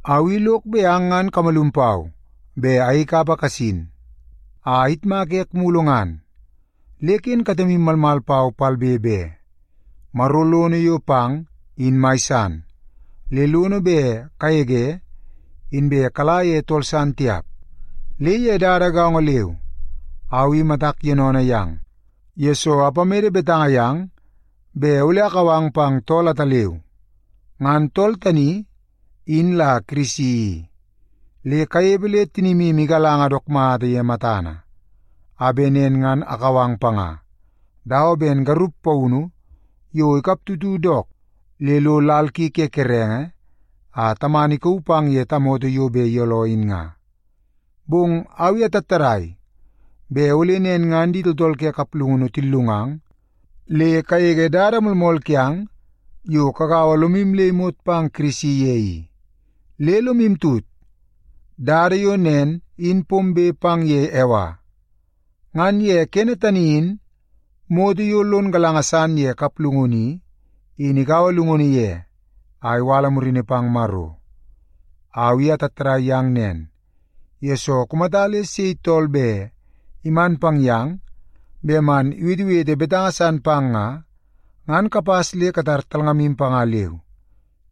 Au i lok bet ang ngan kamalum pau bet ayei kapa kasin a ayitmaka ek mulu ngan. Le ken katemu malmal pau palbe be. Maro lono yo pang in mai san, le lono bet kagege inbe kala ye tool san tiap. Le ye dada gaongo leu au i matak yoonoonoo yang, yesoo apamede betanga yang bet ole akau ang pang tool ataleu. Ngan tool tani in la Kirisi i. Le kanepe le tinimu igalanga dook mata ye matana, a bet nen ngan akau ang panga, dawa ben garup paunu yo ikap tutu dook le lo lal ki ke kerenge a tamana ikauu pang ye tamoto yo bet iyooloo in nga. Bong au i atattadai bet ole nen ngan di tooltool ke kaplungunu tillungang le kagege dada moolmool kiang yo kagaua lomu le imot pang Kirisi ye i. Le lomu tut, dada yo nen in pombe pang ye Ewa. Ngan ye kene tani in moto yo lon galanga san ye kaplungunu i, in ikaua llungunu ye a iwala murini pang Maro. Au i atattadai yang nen, yesoo kumata le sei tool bet iman pang yang bet man iwetewete betanga san pang nga, ngan kapas le katar talngamu panga leu.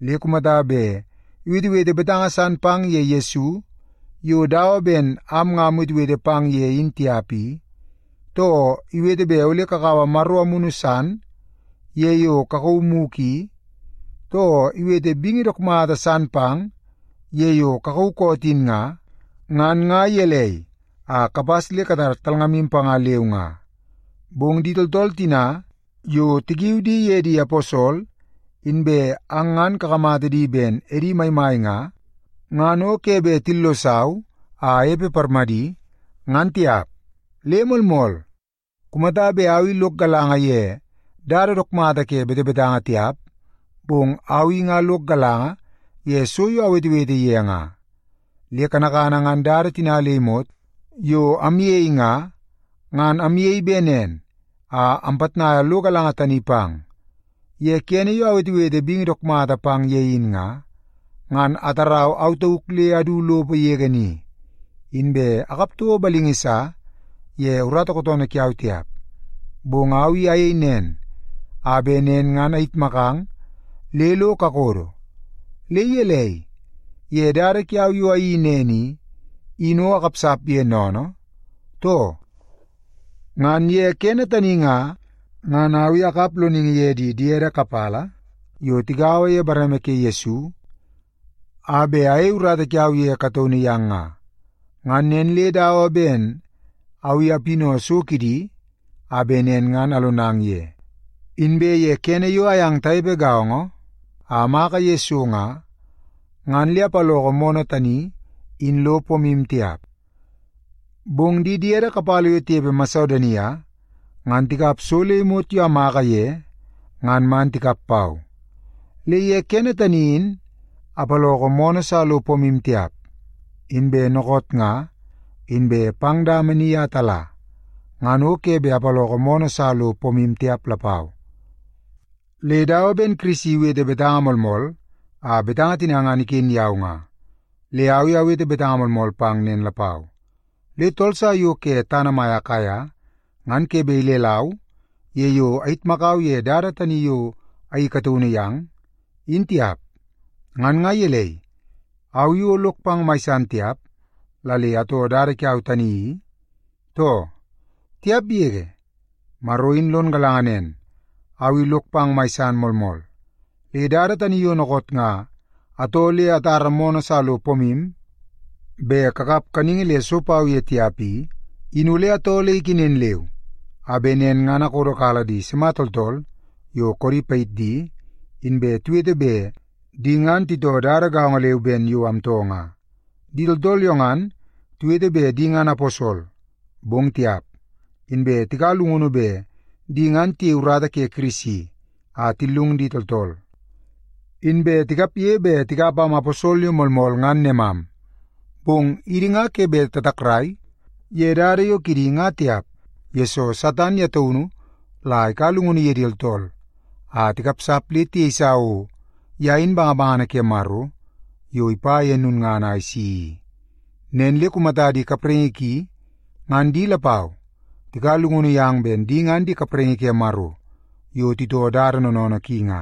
Le kumata bet iwetewete betanga san pang ye Yesu yo dawa ben am nga amwetewete pang ye in tiap i, too iwete bet ole kakaua maro amunu san ye yo kakauu mugu i, too iwete bingi dook mata san pang ye yo kakauu koot in nga, ngan nga gelei a kapas le katar talngamu panga leu nga. Bong di tooltool tina yo tikiu di ye di aposol, inbe ang ngan kakamata di ben edi maimai nga, ngan o ke bet tillosau a anepe parmadi, ngan tiap. Le moolmool, kumata bet au i lok galanga ye dada dook mata ke betebetanga tiap, bong au i nga lok galanga ye so yo awetewete ye nga. Le kanakana ngan dada tina le imot yo amyei nga, ngan amyei bet nen a ampitnaia lo galanga tani pang. Ye kene yo awetewete bingi dook mata pang ye in nga, ngan atarau au tauk le adu lopo yege ni, inbe akap toko balingi sa ye urata kootoonoo kiau tiap. Bong au i ayei nen a bet nen ngan ayitmakang le lo kakodo. Le gelei, ye dada kiau yo ayeii nen i, in o akapsap ye sennene, too? Ngan ye kene tani nga, ngan au i akap loningi ye di diede kapala yo tigaua ye bareme ke Yesu a bet ayei urata kiau ye kataunu yang nga. Ngan nen le dawa ben au i apinau so kidi a bet nen ngan alonang ye. Inbe ye kene yo ayang tanepe gaongo a amaka ye so nga, ngan le apaloko moonoo tani in lo pomu tiap. Bong di diede kapala yo tinepe Masedonia ngan tikap so le imot yo amaka ye ngan man tikap pau. Le ye kene tani in apaloko moonoo sa lo pomu tiap, inbe dookoot nga inbe pang dama ni a tala, ngan o ke bet apaloko moonoo sa lo pomu tiap lapau. Le dawa ben Kirisi iwete betanga moolmool, a betanga tina ngan iken yau nga, le au i awete betanga moolmool pang nen lapau! Le tooltool sa yo ke tana mai Akaia ngan ke bet ilelau ye yo ayitmakau ye dada tani yo ayeii kataunu yang, in tiap. Ngan nga gelei, au i o lok pang mai san tiap la le atoo dada kiau tani i, too? Tiap yege, Maro in lon galanga nen, au i lok pang mai san moolmool! Le dada tani yo dookoot nga atoo le atara moonoo sa lo pomu bet kakap kaningi le so pau ye tiap i, in ole atoo le ikenen leu, a bet nen ngan akodokala di sima tooltool yo koodi payit di, inbe tiwete bet di ngan titoo dada gaongo leu ben yo amtoo nga. Di tooltool yo ngan tiwete bet di ngan aposol, bong tiap. Inbe tikaua llungunu bet di ngan tiyei urata ke Kirisi a tillungu di tooltool, inbe tikapge bet tikap am aposol yo moolmool ngan nemam. Bong idi nga ke bet tatakrai ye dada yo kidi nga tiap, yesoo Satan ye taunu la ikaua llungunu ye di tooltool a tikapsap le tiyeisa o ye in bangabangana ke Maro yo ipa ye lulngana a isi i. Nen le kumata di kapraingi ki ngan di lapau tikaua llungunu yang bet di ngan di kapraingi ke Maro yo titoo dada noonoonoo ki nga,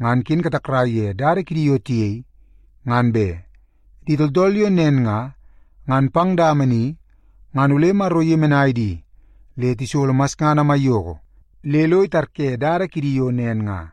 ngan ken katakrai ye dada kidi yo tiyei, ngan be. Di tooltool yo nen nga, ngan pang dama ni ngan ole Maro iyemenai di le tisolo masngana maiyoko le lo itarye dada kidi yo nen nga.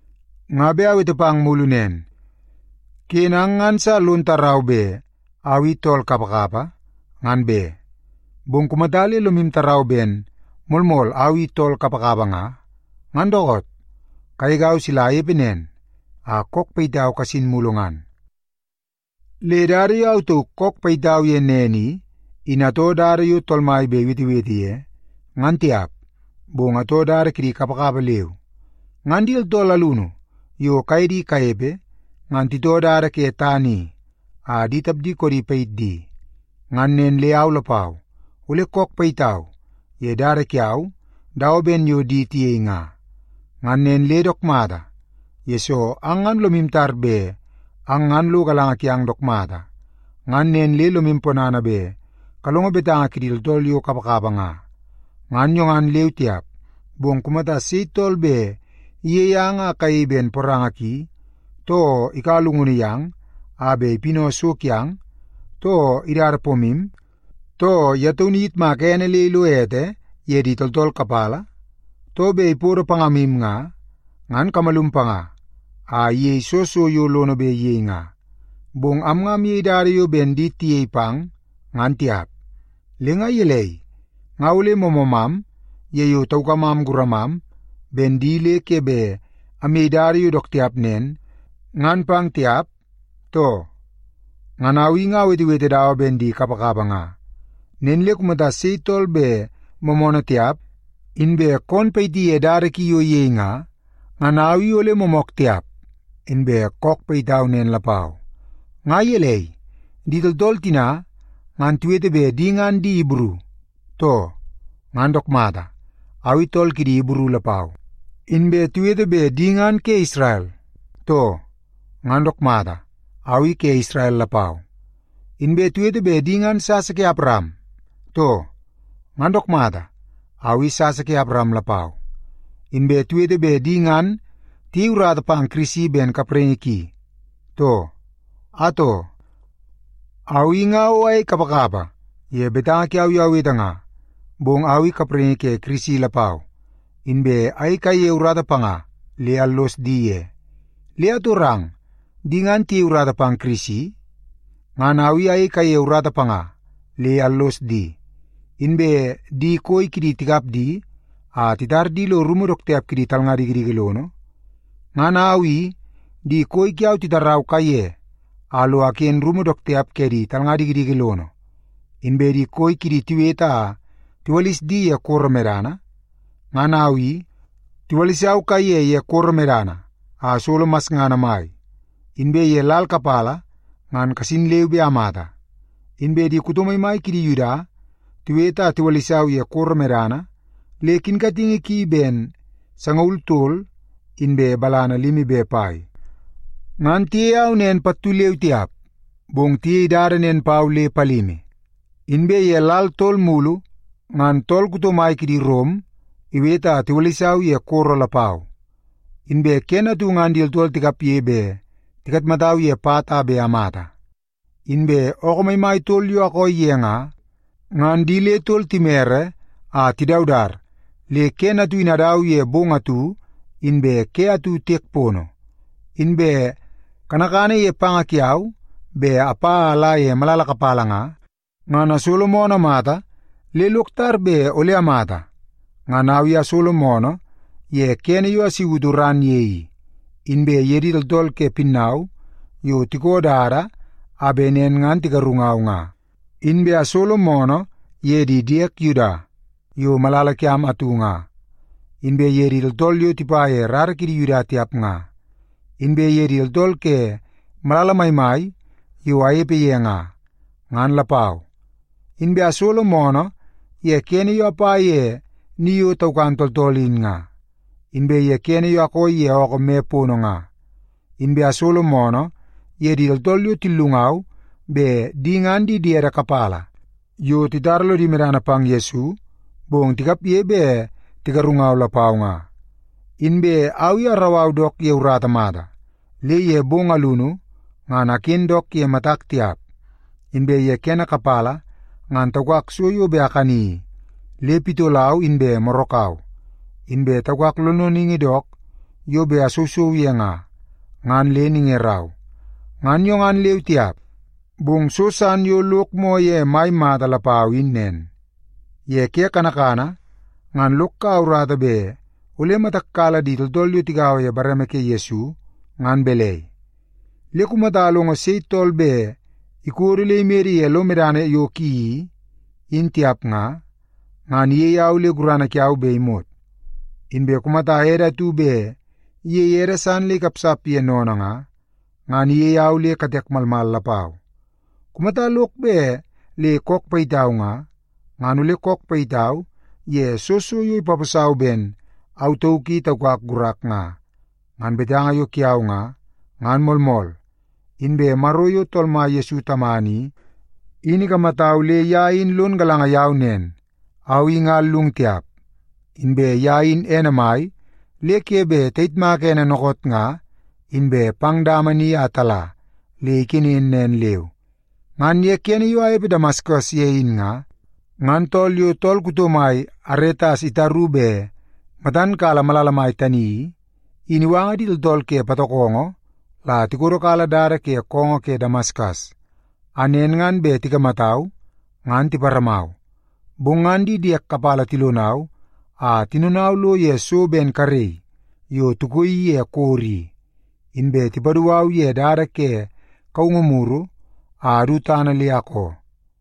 Nga bet awete pang mulu nen; ken ang ngan sa lon tarau bet au i tool kapakapa, ngan be. Bong kumata le lomu tarau ben moolmool au i tool kapakapa nga, ngan dookoot, kagegau sila anepe nen a kook payitau kasin mulu ngan. Le dada yo au tauk kook payitau ye nen i, in atoo dada yo Tool Mai bet iwetewete ye, ngan tiap, bong atoo dada kidi kapakapa leu. Ngan di tooltool alunu yo kaye di kanepe, ngan titoo dada ke tana i a di tapdi koodi payit di. Ngan nen le au lapau, ole kook payitau ye dada kiau dawa ben yo di tiyei nga. Ngan nen le dook mata, yesoo ang ngan lomu tar bet ang ngan lo galanga kiang dook mata, ngan nen le lomu ponana bet kalongo betanga kidi tooltool yo kapakapa nga. Ngan yo ngan leu tiap, bong kumata sei tool bet iyei ang a kayei ben poranga ki, too ikaua llungunu yang a bet ipinau so kiang, too idada pomu, too ye taunu iyitmaka ene le ilo ete ye di tooltool kapala, too bet ipodo pangamu nga, ngan kamalum panga a iyei soo so yo lono bet iyei nga. Bong am nga amyei dada yo ben di tiyei pang, ngan tiap. Le nga gelei, nga ole moomoomam ye yo taukamam guramam ben di le ke bet amyei dada yo dook tiap nen, ngan pang tiap, too? Ngan au i nga awetewete dawa ben di kapakapa nga. Nen le kumata sei tool bet moomoonoo tiap, inbe koon payiti ye dada ki yo iyei nga, ngan au i ole moomook tiap, inbe kook payitau nen lapau. Nga gelei, di tooltool tina ngan tiwete bet di ngan di Ibru, too? Ngan dook mata, au i tool kidi Ibru lapau. Inbe tiwete bet di ngan ke Isrel, too? Ngan dook mata, au i ke Isrel lapau. Inbe tiwete bet di ngan sasa ke Awaram, too? Ngan dook mata, au i sasa ke Awaram lapau. Inbe tiwete bet di ngan tiyei urata pang Kirisi ben kapraingi ki, too? Atoo, au i nga o ayei kapakapa ye betanga kiau yo awete nga, bong au i kapraingi ke Kirisi lapau, inbe ayei kaiye urata panga le allos di ye. Le atorang, di ngan tiyei urata pang Kirisi? Ngan au i ayei kaiye urata panga, le allos di. Inbe di koi kidi tikap di a titar di lo rumu dook tiap kidi talnga dikidiki lono? Ngan au i, di koi kiau titarau kaiye a lo aken rumu dook tiap ke di talnga dikidiki lono. Inbe di koi kidi tiwete a tiwalis di ye koro medana? Ngan au i, tiwalisau kaiye ye koro medana a asolo masngana mai, inbe ye lal kapala ngan kasin leu be amata. Inbe di kuto maimai kidi Yuda tiwete a tiwalisau ye koro medana le kinkatingi ki ben sangaul tol inbe balana limi be pai. Ngan tiyei au nen pattu leu tiap, bong tiyei dada nen pau le palimi. Inbe ye lal tol mulu, ngan tool kuto mai kidi Rom iwete a tiwalisau ye koro lapau. Inbe kene atu ngan di tooltool tikapge bet tikatmatau ye pat a bet amata. Inbe ookoo maimai tol yo akooi ye nga, ngan di le tol timere a tidaudat le kene atu in adau ye bong atu inbe ke atu tiek pono. Inbe kanakana ye panga kiau bet apa a ala ye malala kapala nga, ngan asolo moonoo mata le lok tar bet ole amata. Ngan au i asolo moonoo ye kene yo asautu ran ye i, inbe ye di tooltool ke pinnau yo tiko dada a bet nen ngan tigarungau nga. Inbe asolo moonoo ye di diek Yuda yo malala kiam atu nga, inbe ye di tooltool yo tipa ye rara kidi Yuda tiap nga, inbe ye di tooltool ke malala maimai yo anepe ye nga, ngan lapau. Inbe asolo moonoo ye kene yo apa ye ni yo taukan tooltool in nga, inbe ye kene yo akooi ye ookoo me pono nga. Inbe asolo moonoo ye di tooltool yo tillungau bet di ngan di diede kapala yo titara lodi medana pang Yesu, bong tikapge bet tigarungau lapau nga. Inbe au i arau au dook ye urata mata, le ye bong alunu ngan aken dook ye matak tiap. Inbe ye kene kapala ngan taukak so yo bet akani i, le pitolau inbe morakau. Inbe taukak lonloningi dook yo bet asousou ye nga, ngan le ningerau. Ngan yo ngan leu tiap, bong so san yo lok moo ye mai mata lapau in nen. Ye ke kanakana ngan lok kaua urata bet ole matak kala di tooltool yo tigaua ye bareme ke Yesu ngan balai. Le kumata alongo sei tool bet ikodo le imede ye lo medana yo ki i, in tiap nga, ngan iyei au le gurana kiau bet imot. Inbe kumata ede atu bet iyei ede san le ikapsap ye sennene nga, ngan iyei au le katek malmal lapau. Kumata lok bet le kook payitau nga, ngan ole kook payitau ye soo so yo ipaposau ben au tauk i taukak gurak nga. Ngan betanga yo kiau nga, ngan moolmool. Inbe Maro yo Tool Mai Yesu Tamana i, in ikamatau le ye in lon galanga yau nen, au i nga allung tiap. Inbe ye in ene mai le ke bet tayitmaka ene dookoot nga inbe pang dama ni a tala le ikenen nen leu. Ngan ye kene yo anepe Damaskas ye in nga, ngan tool yo tool kuto mai Aretas itaru bet matan kala malala mai tani i, in iwanga di tooltool ke patokongo la tikodokala dada ke koongoo ke Damaskas, a nen ngan bet tikamatau ngan tiparamau. Bong ngan di diek kapala tilonau a tinonau lo ye so ben karei yo tikoii ye koro i, inbe tipadu au ye dada ke kaungu muru a adu tana le akoo.